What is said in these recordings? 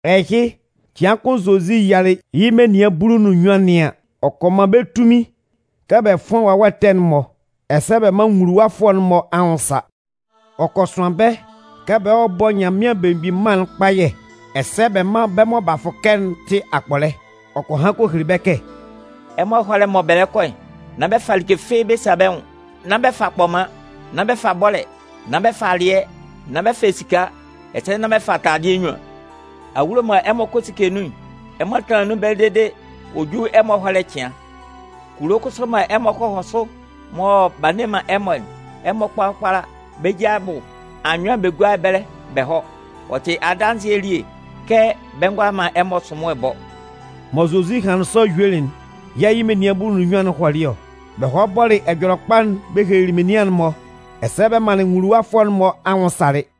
Ɛhɩ cɩan kʋn Zozi yialɩ yɩ́ menian bulu nʋn nnyuan nɩn an, ɔ kɔ man bɛ́ tunmin kɛ bɛ fʋ́an wawɛ ɛtɛ'n-mɔ, ɛsɛ bɛ mán nwuluwafʋɛ'n-mɔ anwʋn sá. Ɔ kɔ sʋan bɛ́ kɛ bɛ hɔ́ bɔ́ Nyanmɩan Belemgbin Mân'n kpayɛ, ɛsɛ bɛ mán bɛ́ mɔ b'a fʋkɛ'n tɩ́ akpɔlɛ. Ɔ kɔ han kɔ hele bɛ́ kɛ: “Ɛmɔ ɛhɔlɛ'n mɔ bɛ lɛ kɔ'n, nán bɛ fa like fɩ́ɩ́ bɛ sa bɛ́ nwʋn. Nán bɛ fa kpɔman, nán bɛ fa bɔ́lɛ, nán bɛ fa alɩɛ, nán bɛ fa esika, ɛsɛ nán bɛ fa taladɩɛ nnyuan. Awulo mɔ ɛmɔ kɔ sike nun'n, ɛmɔ tánlan nun ɛbɛlɛ dede ɔ jú ɛmɔ ɛhɔlɛ cɩan. Kulo kʋsʋ mɔ ɛmɔ kɔ hɔ sʋ mɔ b'a nne man ɛmɔ'n, ɛmɔ kpɔ́kpala bɛ́ ja nɩn abʋ anyʋan'n bɛ gúa ɛbɛlɛ bɛ hɔ́. Ɔ tɩ adanzɩɛ elie kɛ bɛ ngʋala man ɛmɔ sʋnmʋɛ bɔ.” Mɔ Zozi hanlɩn sɔ yuelɩ'n yɛ̂ yɩ́ menian bulu nʋn nnyuan'n hɔlɩ ɔ. Bɛ hɔlɩ bɔlɩ Ɛjɔlɛkpa'n bɛ helelɩ menian'n-mɔ ɛsɛ bɛ manlɩn nwuluwafʋɛ'n-mɔ anwʋn salɩ.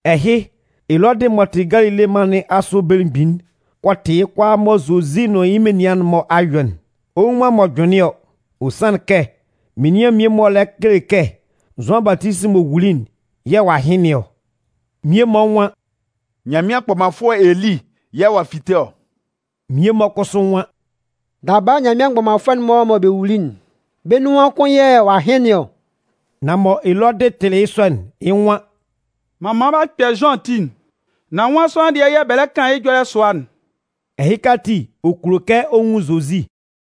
Ɛhɩ Elɔdɩ m'ɔ tɩ Galile mân nɩn asʋ belemgbin'n kɔ tɩ yɩ́ kʋalaa mɔ Zozi nʋn yɩ́ menian'n-mɔ a yɔ'n. Ɔ nnwun man m'ɔ jʋnlɩn ɔ, ɔ sanlɩn kɛ menian mmie-mɔ lɛ kele kɛ Zʋan Batisi m'ɔ wuli'n yɛ̂ ɔ'a hɩn nɩn ɔ. Mmie-mɔ nwan: “Nyanmɩan kpɔmanfʋɛ Eli yɛ̂ ɔ'a fite ɔ.” Mmie-mɔ kʋsʋ nwan: “Daba Nyanmɩan mgbɔmanfʋɛ'n-mɔ mɔ bɛ wuli'n, bɛ́ nunhan kʋn yɛ̂ ɔ'a hɩn nɩn ɔ.” Nan mɔ Elɔdɩ tɩlɩ yɩ́ sɔ'n, yɩ́ nwan: “M'an man b'a kpɛ Zʋan ati'n. Nan nwan sʋanlan dɩɛ yɛ̂ bɛ lɛ kan yɩ́ ɛjɔlɛ sʋa'n?” Ɛhɩka ati, ɔ kulo kɛ ɔ nwun Zozi.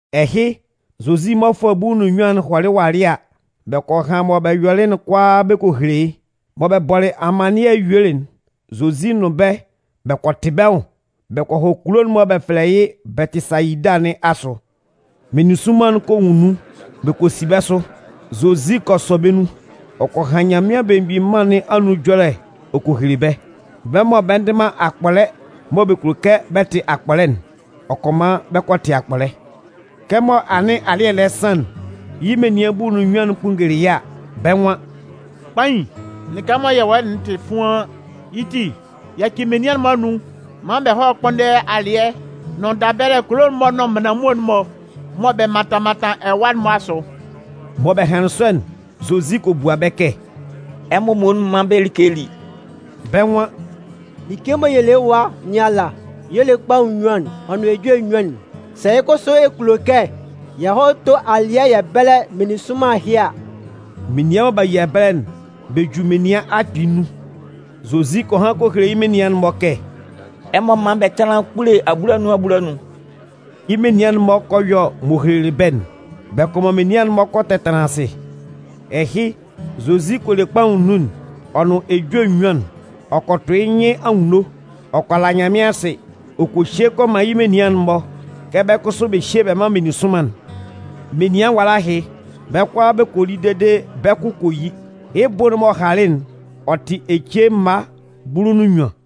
Ɛhɩ Zozi mmɔfʋɛ bulu nʋn nnyuan'n hɔlɩ walɩ a, bɛ kɔ han mɔ bɛ yɔlɩ'n kʋalaa bɛ kɔ hele yɩ́. Mɔ bɛ bɔlɩ amannɩɛ yuelɩ'n, Zozi nʋn bɛ́ bɛ kɔ tɩ bɛ́ nwʋn bɛ kɔ hɔ kulo'n mɔ bɛ fɛlɛ yɩ́ Bɛtɩsayida nɩn asʋ. Meninsʋnman'n kɔ nwun nun bɛ kɔ si bɛ́ sʋ. Zozi kɔ sɔ bɛ́ nun, ɔ kɔ han Nyanmɩan Belemgbin Mân nɩn anun ɛjɔlɛ ɔ kɔ hele bɛ́. Bɛ́ mɔ bɛ ndɩ man akpɔlɛ mɔ bɛ kulo kɛ bɛ tɩ akpɔlɛ'n, ɔ kɔ man bɛ kɔ tɩ akpɔlɛ. Kɛmɔ anɩn alɩ́ɛ lɛ san'n, yɩ́ menian bulu nʋn nnyuan'n kpunngelɩ yɩ́ a, bɛ́ nwan “Kpain, lɩka mɔ yɛ wɔ'n tɩ fuaan. Yɩ́ ti, yaci menian'n-mɔ anun maan bɛ hɔ́ kpʋ́nndɛ alɩɛ nʋn dabɛlɛ kulo'n-mɔ nʋn nanmue'n-mɔ mɔ bɛ mantan mantan ɛwa'n-mɔ asʋ.” Mɔ bɛ hanlɩn sɔ'n, Zozi kɔ bua bɛ́ kɛ: “Ɛmɔ muonun mán bɛ like lí!” Bɛ́ nwan: “Like mɔ yɛ le yɩ́ ɛwa nɩn ala y'ɔ le kpaʋn nnun'n ɔ nʋn ejue nnyuan'n. Sɛ kʋsʋ ɛ kulo kɛ yɛ hɔ́ tó alɩɛ yɛ bɛ́lɛ meninsʋnman ɛhɩ a?” (Menian mɔ b'a yia ɛbɛlɛ'n, bɛ ju menian akpɩɩ nnun.) Zozi kɔ han kɔ hele yɩ́ menian'n-mɔ kɛ: “Ɛmɔ mán bɛ tɛ́tanlan kpule abulanun abulanun.” Yɩ́ menian'n-mɔ kɔ yɔ m'ɔ helelɩ bɛ́'n, bɛ kɔ man menian'n-mɔ kɔ tɛtanlan asɩ. Ɛhɩ, Zozi kɔ le kpaʋn nnun'n ɔ nʋn ejue nnyuan'n. Ɔ kɔ tʋ yɩ́ nyɩn anwunno, ɔ kɔ la Nyanmɩan asɩ. Ɔ kɔ hye kɔ man yɩ́ menian'n-mɔ kɛ bɛ́ kʋsʋ bɛ hyé bɛ mán meninsʋnman'n. Menian nwala ɛhɩ, bɛ́ kʋalaa bɛ kɔ li dede bɛ́ kʋ kɔ yi. Yɩ́ bʋ'n mɔ halɩ'n ɔ tɩ ece mma bulu nʋn nnyuan.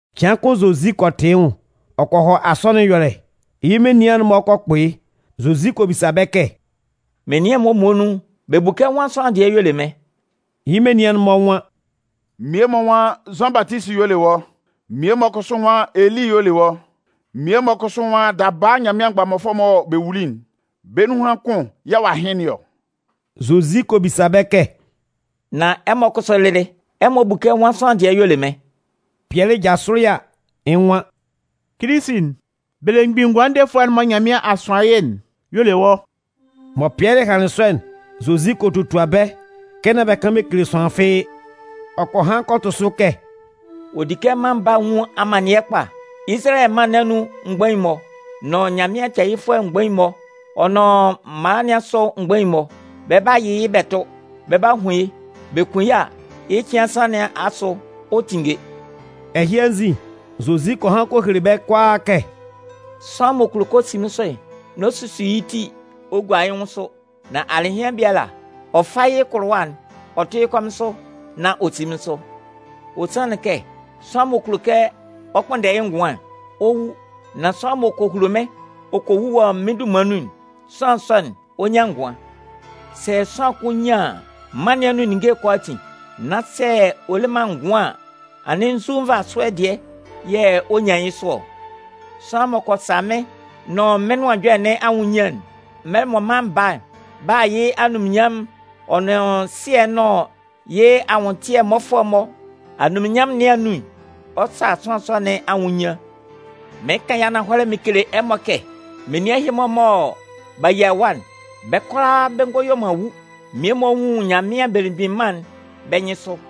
Cɩan kʋn Zozi kɔ tɩ yɩ́ nwʋn ɔ kɔ hɔ asɔnɩn ɛyɔlɛ, yɩ́ menian'n-mɔ kɔ kpʋ yɩ́. Zozi kɔ bisa bɛ́ kɛ: “Menian'n-mɔ muonun, bɛ bu kɛ nwan sʋanlan dɩɛ y'ɔ le mɩ́n?” Yɩ́ menian'n-mɔ nwan: “Mmie-mɔ nwan Zʋan Batisi y'ɔ le wɔ́. Mmie-mɔ kʋsʋ nwan Eli y'ɔ le wɔ́. Mmiekun-mɔ nwan daba Nyanmɩan mgbɔmanfʋɛ'n-mɔ mɔ bɛ wuli'n, bɛ́ nunhan kʋn yɛ̂ ɔ'a hɩn nɩn ɔ.” Zozi kɔ bisa bɛ́ kɛ: “Nan ɛmɔ kʋsʋ lɩlɩ, ɛmɔ bu kɛ nwan sʋanlan dɩɛ y'ɔ le mɩ́n?” Pɩɛlɩ jasʋlɩ a, yɩ́ nwan: “Kilisi'n, Belemgbin Ngʋandefʋɛ'n mɔ Nyanmɩan a sʋan yɩ́'n y'ɔ le wɔ́.” Mɔ Pɩɛlɩ hanlɩn sɔ'n, Zozi kɔ totua bɛ́ kɛ nán bɛ kan bɛ kele sʋanlan fɩ́ɩ́. Ɔ kɔ han kɔ tʋ sʋ kɛ: “Ɔ di kɛ Mân Baa'n nwun amannɩɛ kpa. Izalayɛ mân nɩn anun mgbain'n-mɔ, nʋn Nyanmɩan tɛɛyɩfʋɛ mgbain'n-mɔ ɔ nʋn mala nɩn asʋ mgbain'n-mɔ, bɛ 'ba yɩ yɩ́ bɛ tʋ. Bɛ 'ba hun yɩ́. Bɛ kun yɩ́ a, yɩ́ cɩan nsan nɩn asʋ ɔ 'tinnge.” Ɛhɩ anzin, Zozi kɔ han kɔ hele bɛ́ kʋalaa kɛ: “Sʋanlan m'ɔ kulo kɛ ɔ si mɩ́n sʋ'n, n'ɔ susu yɩ́ ti ɔ gua yɩ́ nwʋn sʋ. Nan alɩhɩan biala, ɔ fá yɩ́ kʋlʋwa'n ɔ tʋ́ yɩ́ kɔmɩn sʋ, nán ɔ sí mɩ́n sʋ. Ɔ sanlɩn kɛ sʋanlan m'ɔ kulo kɛ ɔ kpʋnndɛ yɩ́ ngʋan'n, ɔ 'wu. Nan sʋanlan m'ɔ kɔ hulo mɩ́n ɔ kɔ wu wɔ mɩ́n dunman nun'n, sʋanlan sɔ'n, ɔ 'nyan ngʋan. Sɛ sʋanlan kʋn nyan mân nɩn anun ninnge'n kʋalaatin, nan sɛ ɔ le man ngʋan an, anɩn nzu nvasʋɛ dɩɛ yɛ̂ ɔ 'nyan yɩ́ sʋ ɔ? Sʋanlan m'ɔ kɔ sa mɩ́n nʋn mɩ́n Nʋan Ɛjɔlɛ nɩn anwʋn nyian'n, mɛlɛ mɔ Mân Baa'n 'ba a yɩ́ anunminnyanmʋn'n ɔ nʋn Sɩɛ'n nʋn yɩ́ anwʋntɩɛ mmɔfʋɛ'n-mɔ anunminnyanmʋn nɩn anun'n, ɔ 'sa sʋanlan sɔ nɩn anwʋn nyian. Mɩɩn kan yɩ́ ananhɔlɛ mɩn kele ɛmɔ kɛ menian ɛhɩ-mɔ mɔ b'a yia ɛwa'n, bɛ́ kʋalaa bɛ ngo yue man wu, mmie-mɔ 'nwun Nyanmɩan Belemgbin Mân'n bɛ́ nyɩnsʋ.”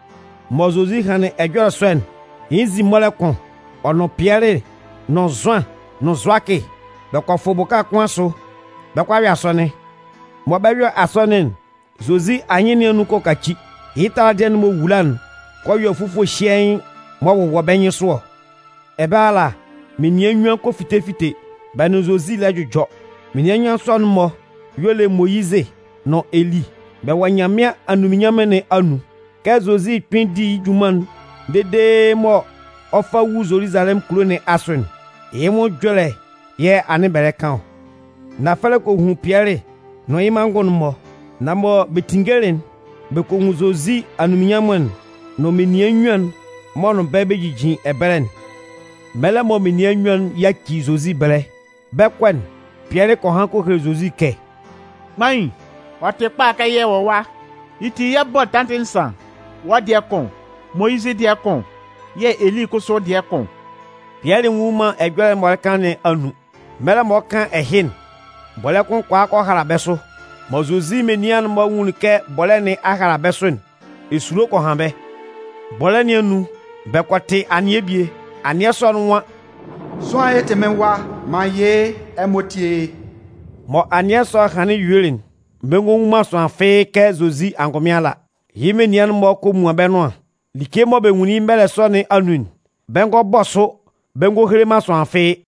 Mɔ Zozi hanlɩn ɛjɔlɛ sɔ'n, yɩ́ nzin mɔlɛ kʋn, ɔ nʋn Pɩɛlɩ nʋn Zʋan nʋn Zʋakɩ, bɛ kɔ fʋ bʋka kʋn asʋ bɛ 'kɔ a yɔ asɔnɩn. Mɔ bɛ 'yɔ asɔnɩn'n, Zozi anyɩn nɩn anun kɔ kaci. Yɩ́ taladɩɛ'n m'ɔ wula'n kɔ yɔ fufue hyɩɛɩn, m'ɔ wʋwɔ bɛ́ nyɩnsʋ ɔ. Ɛbɛlɛ ala, menian nnyuan kɔ fite fite, bɛ nʋn Zozi lɛ jʋjɔ. Menian nnyuan sɔ'n-mɔ y'ɔ le Moyizɩ nʋn Eli. Bɛ wɔ Nyanmɩan anunminnyanmʋn nɩn anun. Kɛ Zozi 'kpɩn di yɩ́ junman'n dede mɔ ɔ 'fa wu Zoluzalɛmʋn kulo nɩn asʋ'n, yɩ́ nwʋn ɛjɔlɛ yɛ̂ anɩn bɛ lɛ kan ɔ. Nafɛlɛ kɔ hun Pɩɛlɩ nʋn yɩ́ manngʋn'n-mɔ. Nan mɔ bɛ tinngelɩ'n, bɛ kɔ nwun Zozi anunminnyanmʋn'n nʋn menian nnyuan'n m'ɔ nʋn bɛ́ bɛ jijin ɛbɛlɛ'n. Mɛlɛ mɔ menian nnyuan'n 'yaci Zozi ɛbɛlɛ bɛ kɔ'n, Pɩɛlɩ kɔ han kɔ hele Zozi kɛ: “Kpain, ɔ tɩ kpa kɛ yɛ wɔ ɛwa. Yɩ́ ti yɛ 'bɔ tantɩ nsan. Wɔ́ dɩɛ kʋn, Moyizɩ dɩɛ kʋn, yɛ̂ Eli kʋsʋ dɩɛ kʋn.” (Pɩɛlɩ nnwun man ɛjɔlɛ'n m'ɔ lɛ kan nɩn anun). Mɛlɛ m'ɔ 'kan ɛhɩ'n, bɔlɛ́ kʋn kɔ a kɔ hala bɛ́ sʋ. Mɔ Zozi menian'n-mɔ nwunlin kɛ bɔlɛ́ nɩn a hala bɛ́ sʋ'n, esulo kɔ han bɛ́. Bɔlɛ́ nɩn anun, bɛ kɔ tɩ anɩɛ bie. Anɩɛ sɔ'n nwan: “Sʋanlan ɛhɩ tɩ mɩ́n Wa, m'an yɩ yɩ́. Ɛmɔ tie yɩ́!” Mɔ anɩɛ sɔ'n hanlɩn sɔ yuelɩ'n, bɛ ngɔ nwun man sʋanlan fɩ́ɩ́ kɛ Zozi angʋnmɩn ala. Yɩ́ menian'n-mɔ kɔ muan bɛ́ nʋan. Like mɔ bɛ nwunlin yɩ́ mɛlɛ sɔ nɩn anun'n, bɛ ngɔ bɔ sʋ bɛ ngɔ hele man sʋanlan fɩ́ɩ́.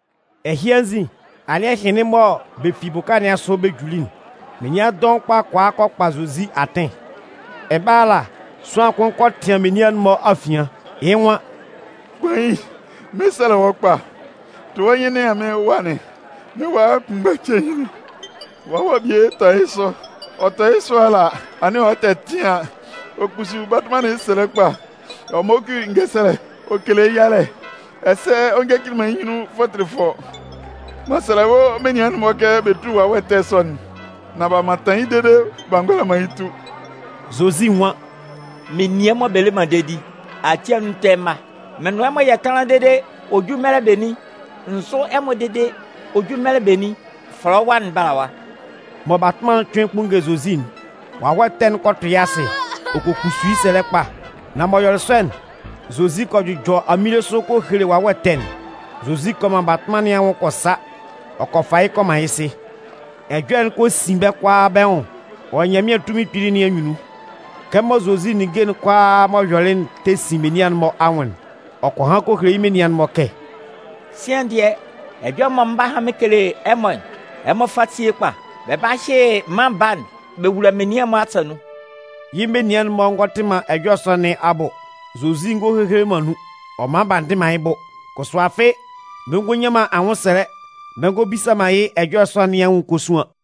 Ɛhɩ anzin, alɩ́ɛ hɩnlɩn mɔ bɛ fi bʋka nɩn asʋ bɛ juli'n, menian dɔʋn kpa kɔ a kɔ kpa Zozi atɩn. Ɛbɛlɛ ala sʋanlan kʋn kɔ tɩan menian'n-mɔ afian Yɩ́ nwan: “Kpain, mɩn 'sɛlɛ wɔ́ kpa, tʋ wɔ́ nyɩn nɩan mɩ́n wa'n, mɩ́n wa kʋnmgba cein'n! Wawɛ bie tɔ yɩ́ sʋ. Ɔ tɔ yɩ́ sʋ ala, ɔ man ɔ tɛtɩan. Ɔ kpusu batʋnman'n sɛlɛ kpa. Ɔ man ɔ cuin ngɛsɛlɛ. Ɔ kele yɩ́ yalɛ. Ɛsɛ ɔ nyaci man yɩ́ nun fɔtɩlɩfɔ. M'an sɛlɛ wɔ́ menian'n-mɔ kɛ bɛ tú wawɛ ɛtɛ sɔ'n. Nan b'a mantan yɩ́ dede b'a ngʋala man yɩ́ tu.” Zozi nwan: “Menian mɔ bɛ le man dedi, ati anun ɛtɛ mma! Mɩn nʋn ɛmɔ yɛ tánlan dede ɔ hɔ́ jú mɛlɛ benin? N zʋ́ ɛmɔ dede ɔ jú mɛlɛ benin? Fa wɔ́ wa'n bala ɛwa!” Mɔ batʋnman'n 'cʋɩn kpunnge Zozi'n, wawɛ'n kɔ tʋ yɩ́ asɩ, ɔ kɔ kpusu yɩ́ sɛlɛ kpa. Nan m'ɔ yɔlɩ sɔ'n, Zozi kɔ jʋjɔ aminle sʋ kɔ hele wawɛ ɛtɛ'n. Zozi kɔ man batʋnman nɩn anwʋn kɔ sa ɔ kɔ fa yɩ́ ɔ kɔ man yɩ́ sɩ. Ɛjɔlɛ'n kɔ sin bɛ́ kʋalaa bɛ́ nwʋn wɔ Nyanmɩan tunmin kpili nɩn anyunnun. Kɛmɔ Zozi ninnge'n kʋalaa mɔ yɔlɩ'n tɛ sin menian'n-mɔ anwʋn'n, ɔ kɔ han kɔ hele yɩ́ menian'n-mɔ kɛ: “Sian dɩɛ, ɛjɔlɛ'n mɔ mɩn 'ba han mɩn kele ɛmɔ'n, ɛmɔ fá bɛ síe kpa. Bɛ 'ba hyɩ Mân Baa'n bɛ wula menian'n-mɔ asa nun.” Yɩ́ menian'n-mɔ ngɔ tɩ man ɛjɔlɛ sɔ nɩn abʋ. Zozi ngɔ hehele man nun, ɔ man b'a ndɩ man yɩ́ bʋ. Kʋsʋ afɩ, bɛ ngɔ nyan man anwʋnsɛlɛ bɛ ngɔ bisa man yɩ́ ɛjɔlɛ sɔ nɩn anwʋn kosuan.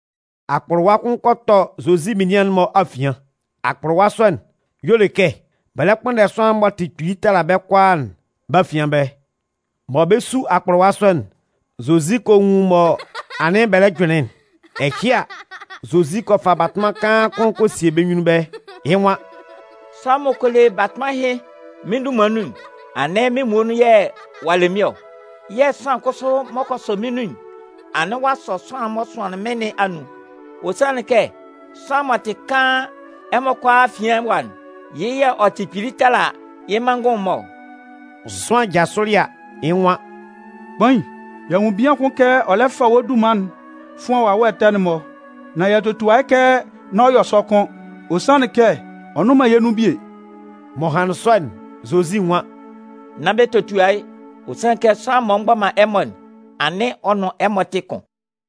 Akpʋlʋwa kʋn tɔlɩ Zozi menian'n-mɔ afian. Akpʋlʋwa sɔ'n y'ɔ le kɛ bɛ lɛ kpʋnndɛ sʋanlan m'ɔ tɩ kpili tala bɛ́ kʋalaa'n bɛ́ afian ɛbɛlɛ. Mɔ bɛ 'su akpʋlʋwa sɔ'n, Zozi kɔ nwun mɔ anɩn bɛ lɛ jʋnlɩn'n. Ɛhɩ a, Zozi kɔ fa batʋnman kaan kʋn kɔ sie yɩ́ nwʋn ɛbɛlɛ, yɩ́ nwan: “Sʋanlan m'ɔ kɔ le batʋnman ɛhɩ mɩ́n dunman nun'n, anɩn mɩ́n muonun yɛ̂ ɔ'a le mɩ́n ɔ. Yɛ̂ sʋanlan kʋsʋ m'ɔ kɔ sɔ mɩ́n nun'n, anɩn ɔ'a sɔ sʋanlan'n m'ɔ sʋanlɩn mɩ́n nɩn anun. Ɔ sanlɩn kɛ sʋanlan m'ɔ tɩ kaan ɛmɔ kʋalaa afian ɛwa'n, yɩ́ yɛ̂ ɔ tɩ kpili tala yɩ́ manngʋn'n-mɔ ɔ.” Zʋan jasʋlɩ a, yɩ́ nwan: “Kpain, y'a nwun bian kʋn kɛ ɔ lɛ fa wɔ́ dunman'n fʋan wawɛ ɛtɛ'n-mɔ, nan y'a totua yɩ́ kɛ nán ɔ yɔ sɔ kʋ́n. Ɔ sanlɩn kɛ ɔ nnʋn man yɛ́ nun bie.” M'ɔ hanlɩn sɔ'n, Zozi nwan: “Nán bɛ totua yɩ́, ɔ sanlɩn kɛ sʋanlan m'ɔ mgbɔ man ɛmɔ'n, anɩn ɔ nʋn ɛmɔ tɩ kʋn.”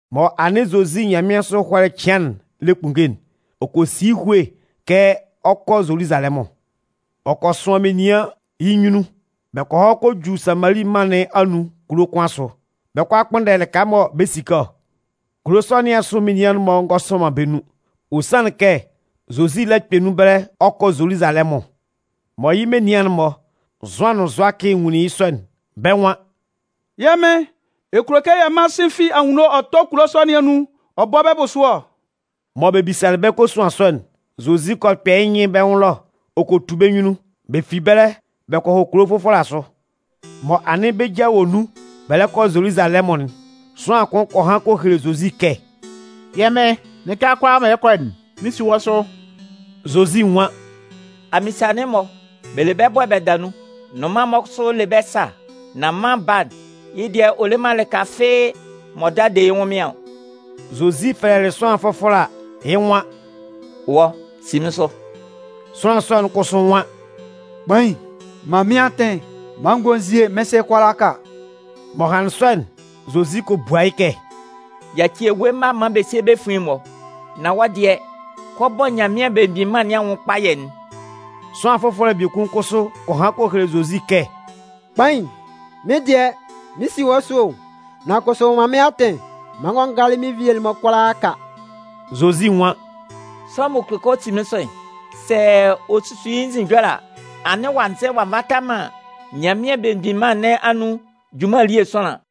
Mɔ anɩn Zozi nyanmɩansʋ ɛhɔlɛ cɩan'n lɛ kpunnge'n, ɔ kɔ si yɩ́ hue kɛ ɔ 'kɔ Zoluzalɛmʋn. Ɔ kɔ sʋan menian yɩ́ nyunnun. Bɛ kɔ hɔ kɔ ju Samali mân nɩn anun kulo kʋn asʋ. Bɛ 'kɔ a kpʋnndɛ lɩka mɔ bɛ 'sike ɔ. Kulo sɔ nɩn asʋ menian'n-mɔ ngɔ sɔ man bɛ́ nun. Ɔ sanlɩn kɛ Zozi lɛ kpɛ nun ɛbɛlɛ ɔ kɔ Zoluzalɛmʋn. Mɔ yɩ́ menian'n-mɔ Zʋan nʋn Zʋakɩ nwunlin yɩ́ sɔ'n, bɛ́ nwan: “Yɛ́ Mɩn, ɛ kulo kɛ yɛ man sɩ̂n fi anwunno ɔ tɔ kulo sɔ nɩn anun ɔ bɔ bɛ́ bʋsʋ ɔ?” Mɔ bɛ bisalɩ kosuan sɔ'n, Zozi kɔ kpɛ yɩ́ nyɩn bɛ́ nwʋn ɛlɔ ɔ kɔ tu bɛ́ nyunnun. Bɛ fi ɛbɛlɛ bɛ kɔ hɔ kulo fʋfɔlɛ asʋ. Mɔ anɩn bɛ́ ja wɔ nun bɛ lɛ kɔ Zoluzalɛmʋn'n, sʋanlan kʋn kɔ han kɔ hele Zozi kɛ: “Yɛ́ Mɩn, lɩka kʋalaa mɔ ɛ 'kɔ'n, mɩn 'si wɔ sʋ.” Zozi nwan: “Aminsanɩn'n-mɔ, bɛ le bɛ́ bɔɛ bɛ da nun. Nnʋnman'n-mɔ kʋsʋ le bɛ́ sâ. Nan Mân Baa'n, yɩ́ dɩɛ, ɔ le man lɩka fɩ́ɩ́ m'ɔ da de yɩ́ ɛnwʋnmɩan ɔ.” Zozi fɛlɛlɩ sʋanlan fʋfɔlɛ a, yɩ́ nwan: “Wɔ́, si mɩ́n sʋ.” Sʋanlan sɔ'n kʋsʋ nwan: “Kpain, man mɩ́n atɩn maan n gɔ n zie mɩ́n sɩ kʋalaaka.” M'ɔ hanlɩn sɔ'n, Zozi kɔ bua yɩ́ kɛ: “Yaci ewue mma maan bɛ síe bɛ́ fuin'n-mɔ, nán wɔ́ dɩɛ, kɔ bɔ Nyanmɩan Belemgbin Mân nɩn anwʋn kpayɛ'n.” Sʋanlan fʋfɔlɛ biekun kʋsʋ kɔ han kɔ hele Zozi kɛ: “Kpain, mɩ́n dɩɛ, mɩn 'si wɔ́ sʋ o, nan kʋsʋ man mɩ́n atɩn maan n gɔ́ n gálɩ mɩ́n nvilie'n-mɔ kʋalaaka.” Zozi nwan: “Sʋanlan m'ɔ kulo kɛ ɔ si mɩ́n sʋ'n, sɛ ɔ susu yɩ́ nzin ɛjɔlɛ a, anɩn ɔ'a nzɛ nvata man Nyanmɩan Belemgbin Mân nɩn anun junman elie sʋanlan.”